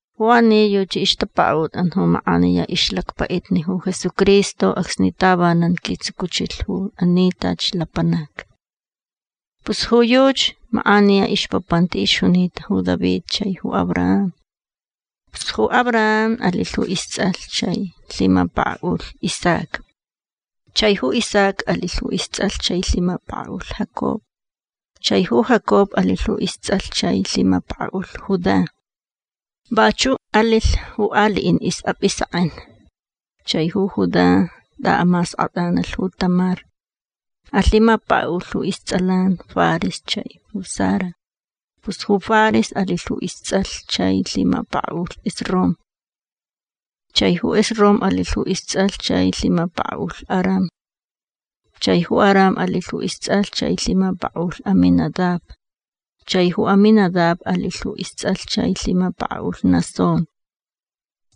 Ju ani yuchi ixtapakaʼutʼan ju makʼaniya ixlacpaʼitni ju Jesucristo acsni tavanan quitsucuchilh ju ani tachi lapanac. Pus ju yuchi makʼaniya ixpapanti ixjunita ju David chai ju Abraham. Pus ju Abraham alilh ju istsʼalh chai lhimapakaʼulh Isaac. Chai ju Isaac alilh ju istsʼalh chai lhimapakaʼulh Jacob. Chai ju Jacob alilh ju istsʼalh chai lhimapakaʼulh Judá. Vachuʼ alilh ju aliʼin isʼapʼisekʼen. Chai ju Judá tʼaʼamaskʼatʼanalh ju Tamar. Alhimapakaʼulh ju istsʼalan Fares chai ju Zara. Pus ju Fares alilh ju istsʼalh chai lhimapakaʼulh Esrom. Chai ju Esrom alilh ju istsʼalh chai lhimapakaʼulh Aram. Chai ju Aram alilh ju istsʼalh chai lhimapakaʼulh Aminadab. Chai ju Aminadab alilh ju istsʼalh chai lhimapakaʼulh Naasón.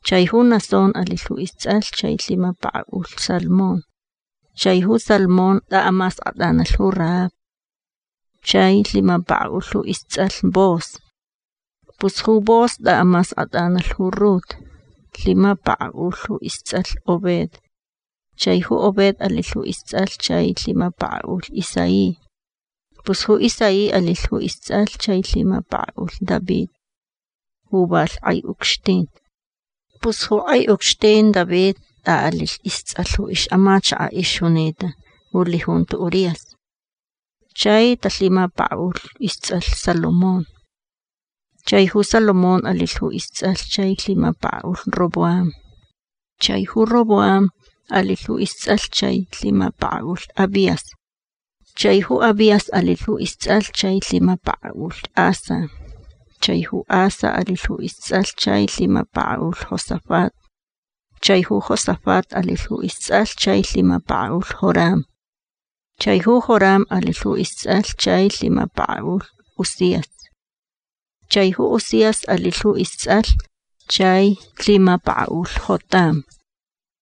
Chai ju Naasón alilh ju istsʼalh chai lhimapakaʼulh Salmón. Chai ju Salmón tʼaʼamaskʼatʼanalh ju Rahab. Chai lhimapakaʼulh ju istsʼalh Booz. Pus ju Booz tʼaʼamaskʼatʼanalh ju Rut. Lhimapakaʼulh ju istsʼalh Obed. Chai ju Obed alilh ju istsʼalh chai lhimapakaʼulh Isaí. Pus ju Isaí alilh ju istsʼalh chai lhimapakaʼulh David ju valh kʼai ucxtin. Pus ju kʼai ucxtin David tʼaʼalilh istsʼalh ju ixʼamachakaʼ ixjunita ju lijunto Urías. Chai talhimapakaʼulh istsʼalh Salomón. Chai ju Salomón alilh ju istsʼalh chai lhimapakaʼulh Roboam. Chai ju Roboam alilh ju istsʼalh chai lhimapakaʼulh Abías. Chai ju Abías alilh ju istsʼalh chai lhimapakaʼulh Asa. Chai ju Asa alilh ju istsʼalh chai lhimapakaʼulh Josafat. Chai ju Josafat alilh ju istsʼalh chai lhimapakaʼulh Joram. Chai ju Joram alilh ju istsʼalh chai lhimapakaʼulh Uzías. Chai ju Uzías alilh ju istsʼalh chai lhimapakaʼulh Jotam.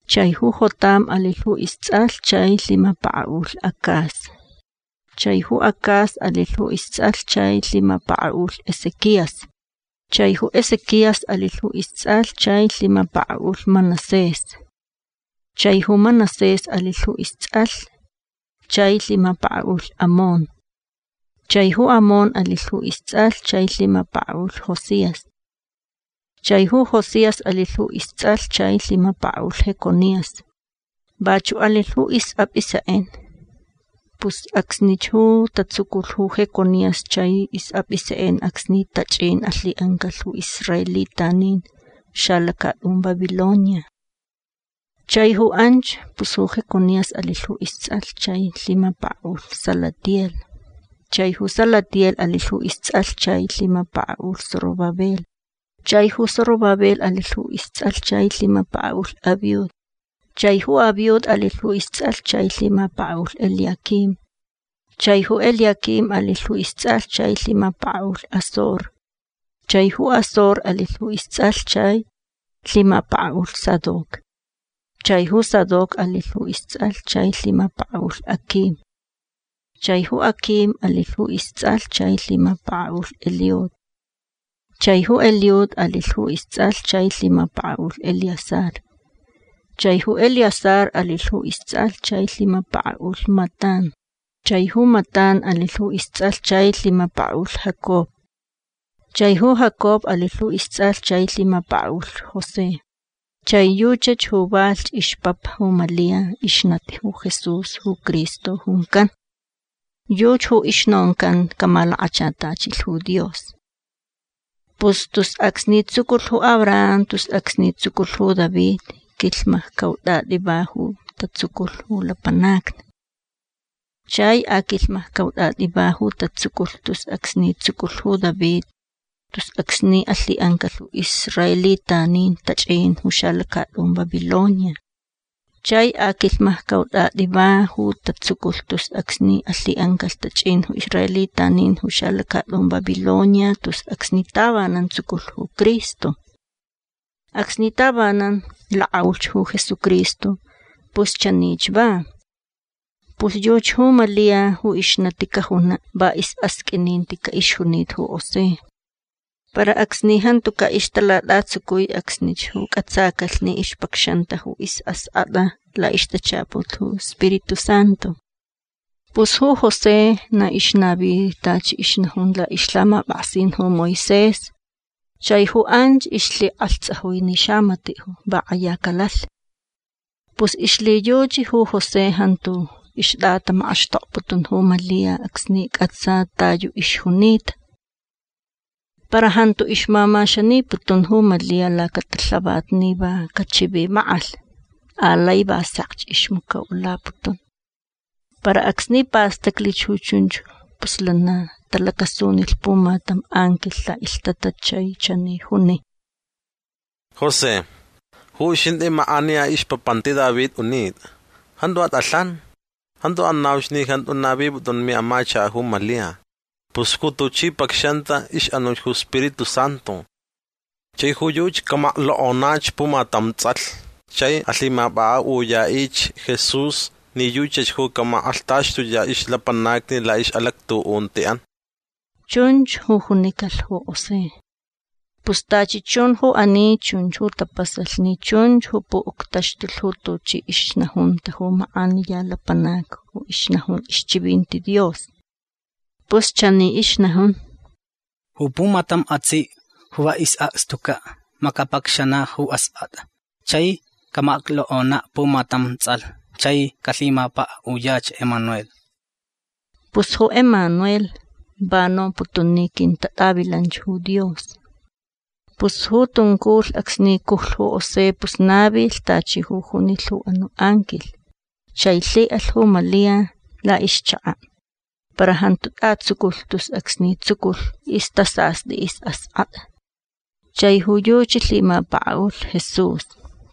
Chai ju Jotam alilh ju istsʼalh chai lhimapakaʼulh Acaz. Chai ju Acaz alilh ju istsʼalh chai lhimapakaʼulh Ezequías. Chai ju Ezequías alilh ju istsʼalh chai lhimapakaʼulh Manasés. Chai ju Manasés alilh ju istsʼalh chai lhimapakaʼulh Amón. Chai ju Amón alilh ju istsʼalh chai lhimapakaʼulh Josías. Chai ju Josías alilh ju istsʼalh chai lhimapakaʼulh Jeconías. Vachuʼ alilh ju isʼapʼisekʼen. Pus acsnich ju tatsuculh ju Jeconías chai isʼapʼisekʼen acsni tachʼin alhiʼancalh ju israelitanin ju xalacatʼun Babilonia. Chai ju anch pus ju Jeconías alilh ju istsʼalh chai lhimapakaʼulh Salatiel. Chai ju Salatiel alilh ju istsʼalh chai lhimapakaʼulh Zorobabel. Chai ju Zorobabel alilh ju istsʼalh chai lhimapakaʼulh Abiud. Chai ju Abiud alilh ju istsʼalh chai lhimapakaʼulh Eliaquim. Chai ju Eliaquim alilh ju istsʼalh chai lhimapakaʼulh Azor. Chai ju Azor alilh ju istsʼalh chai lhimapakaʼulh Sadoc. Chai ju Sadoc alilh ju istsʼalh chai lhimapakaʼulh Aquim. Chai ju Aquim alilh ju istsʼalh chai lhimapakaʼulh Eliud. Chai ju Eliud alilh ju istsʼalh chai lhimapakaʼulh Eleazar. Chai ju Eleazar alilh ju istsʼalh chai lhimapakaʼulh Matán. Chai ju Matán alilh ju istsʼalh chai lhimapakaʼulh Jacob. Chai ju Jacob alilh ju istsʼalh chai lhimapakaʼulh José. Chai yuchach ju valhch ixpapa ju Malia ixnati ju Jesús ju Cristo juncan. Yuchi ju ixnoncan camalakachatachilh ju Dios. Pus tus acsni tsuculh ju Abraham tus acsni tsuculh ju David quilhmaccautʼatʼi va ju tatsuculh ju lapanacni. Chai aquilhmaccautʼatʼi va ju tatsuculh tus acsni tsuculh ju David tus acsni alhiʼancalh ju israelitanin tachʼin ju xalacatʼun Babilonia. Chai aquilhmaccautʼatʼi va ju tatsuculh tus acsni alhiʼancalh tachʼin ju israelitanin ju xalacatʼun Babilonia tus acsni tavanan tsuculh ju Cristo. Acsni tavanan lakʼaulhch ju Jesucristo pus chanich va. Pus yuchi ju Malia ju ixnati cajunaʼ va isʼasqʼuininticaʼ ixjunita ju José. Para acsni jantucaʼ ixtalatʼatsucui acsnich ju cʼatsacalh ni ixpacxanta ju isʼaskʼatʼa laʼixtachaput ju Spiritu Santu. Pus ju José na ixnavi tachi ixnajun laʼixlhamapʼaksin ju Moisés chai ju anch ixlhikʼalhtsajui ni xamatiʼ va kʼaya calalh. Pus ixlhiyuchi ju José jantu ixtʼatamakʼaxtokputun ju Malia acsni cʼatsa ta yu ixjunita. Para jantu ixmamaxaniputun ju Malia lacatalhavat ni va cachivimakʼalh. Alai va sekch ixmacoʼulaputun. Para acsni pastaclich ju chunch pus lana talacasunilh pumatam anquilh laʼilhtatat chai chani juni: ―José. Ju uxintʼi makʼaniya ixpapanti David unitʼa. Jantu atʼalhan. Jantu anauch ni jantu navipʼutʼun miʼamachakaʼ ju Malia. Pus ju tuchi pacxanta ixʼanuch ju Spiritu Santu. Chai ju yuchi camaklokʼonach pumatam tsʼalh chai alhimapʼakʼaʼuyaʼich Jesús ni yuchach ju camakʼalhtaxtuyaʼ ixlapanacni laʼixʼalactuʼuntiʼan. ―Chunch ju junicalh ju José. Pus tachi chun ju ani chunch ju tapasalh ni chunch ju puʼuctaxtulh ju tuchi ixnajunta ju makʼaniya lapanac ju ixnajun ixchivinti Dios. Pus chani ixnajun: Ju pumatam atsiʼ ju va isʼakstucaʼ ma capacxanaʼ ju askʼatʼa chai camaklokʼonaʼ pumatam tsʼalh chai calhimapakaʼuyach Emanuel. Pus ju Emanuel va nomputun ni quintatʼavilanch ju Dios. Pus ju tunculh acsni cujlh ju José pus navilh tachi ju junilh ju anuʼ anquilh chai lhiʼalh ju Malia laʼixchakaʼ. Para jantu tʼatsuculh tus acsni tsuculh istʼasastʼi isʼaskʼatʼa. Chai ju yuchi lhimapakaʼulh Jesús.